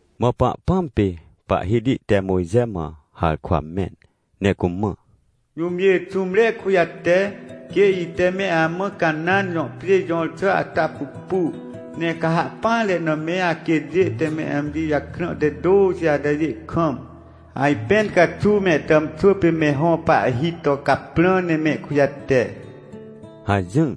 Mã Pahpãm pê Pahhiti te Mojxe mã harkwa mẽn ne cumã: — Jũmjê xũmre kujate, quê ite meamã Canãn jõ pjê jõr xà ata pupu. Ne ca ha ahpỹanre na me aquêtjê te me amji jakrã te tôxi atajê kam, ajpẽn caxuw mehtàmxwỳpê me hõ pahhi to caprã ne mehkujate — hajỹr.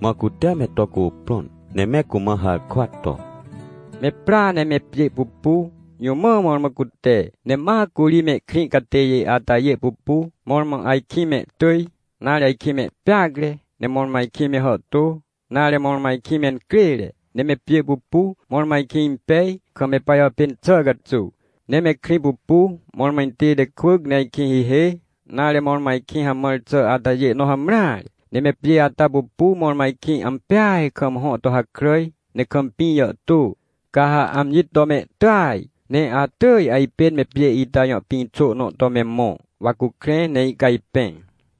Mã cute me to cuprõn, ne me cumã harkwa to: — Me pra ne me pjê pupu, jũ mã mõrmõ cute. Ne ma curi mehkrĩ catêjê atajê pupu, mõrmõ ajkĩ mehtỳj, nare, ajkĩ mehpeacre, ne mõrmõ ajkĩ mehàhtô, nare, mõrmõ ajkĩ mencrêre. Ne me pjê pupu, mõrmõ ajkĩ impej, kam me pajàpên xàcaxuw. Ne me krĩ pupu, mõrmõ intête kwỳc ne ajkĩhihê, nare, mõrmõ ajkĩ hamãr xà atajê nõ hamreare. Ne me pjê ata pupu, mõrmõajkĩ ampeaj kam hõ to hakràj, ne kam pĩ jàhtô. Ca ha amji to mehtỳaj, ne atỳj ajpên me pjê ita jõ pĩxônõ to me mõ, wa cukrẽ ne ihcajpẽ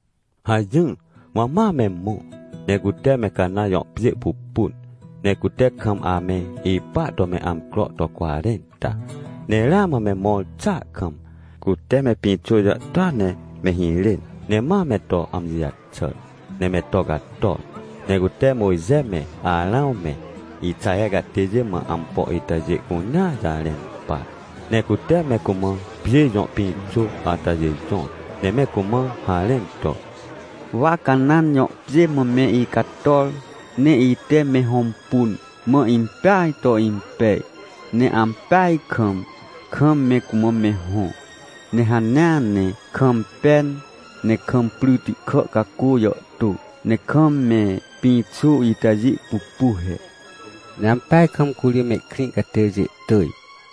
— hajỹr. Mã ma me mõ, ne cute me Canãn jõ pjê pupun, ne cute kam ame ipa to meamcro to cwarẽnta. Ne ramã me mõr xàa kam, cuteme pĩxô jàhtôa ne me hirên. Ne ma me to amji jaxàr, ne me to cator. Ne cute Mojxe me, Arãw me, Ixaher catêjê mã ampo itajê cunea jarẽnpar. Ne cute me cumã pjê jõ pĩxô atajêjõr. Ne me cumã harẽn to: — Wa Canãn jõ pjê mã me icator, ne ite me hõmpun, mã impeajto impej. Ne ampeaj kam, kam mecumã me hõ, ne hanea ne kam pen ne kam pryti kà cacô jàhtô, ne kam me pĩxô itajê pupu he. — Ne ampeaj kam curi mehkrĩcatêjê tỳj,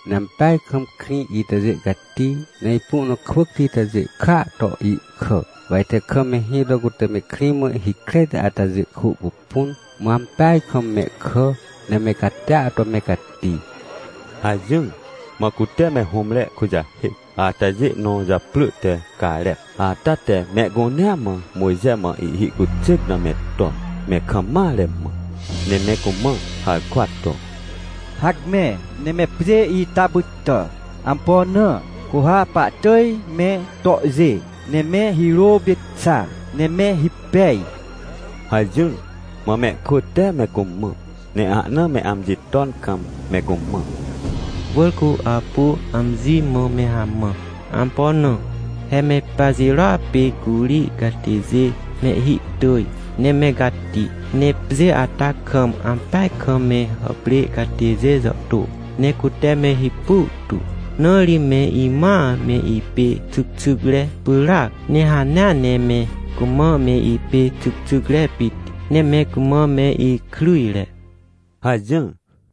ne ampeaj kam krĩ itajê cati, ne ipu nakwỳcti itajê kàa to ihkà. Wa ite kam mehĩ to cute me krĩ mã hikretiatajê kwỳ pupun, mã ampeaj kam mehkà, ne me catia to mecati — hajỹr. Mã cute me hũmre kujahêc atajê nõ japrỳ te Carep ata te mehcunea mãMojxe mã ihhi cuxêc na me ton, me kam mare mã, ne me cumã harkwa to: — Hacme, ne me pjêita pytà! Ampo na? Cu ha pahtỳj me tohjê, ne me hirô pê xa, ne mehipej — hajỹr. Mã mehkwỳ teme cumã, ne ahna me amji ton kam me cumã: — Wỳr cu apu amji mã me hamã! Ampo na? He me pajirôa pê curi catêjêmehhi tỳj, ne me cati. Ne pjê ata kamampeaj kam me hàprê catêjê jàhtô, ne cute mehipu tu. Na ri me imãa me ipê xycxycre pyràac, ne hanea ne me cumã meipê xycxycre pit, ne me cumã me ikryjre — hajỹr.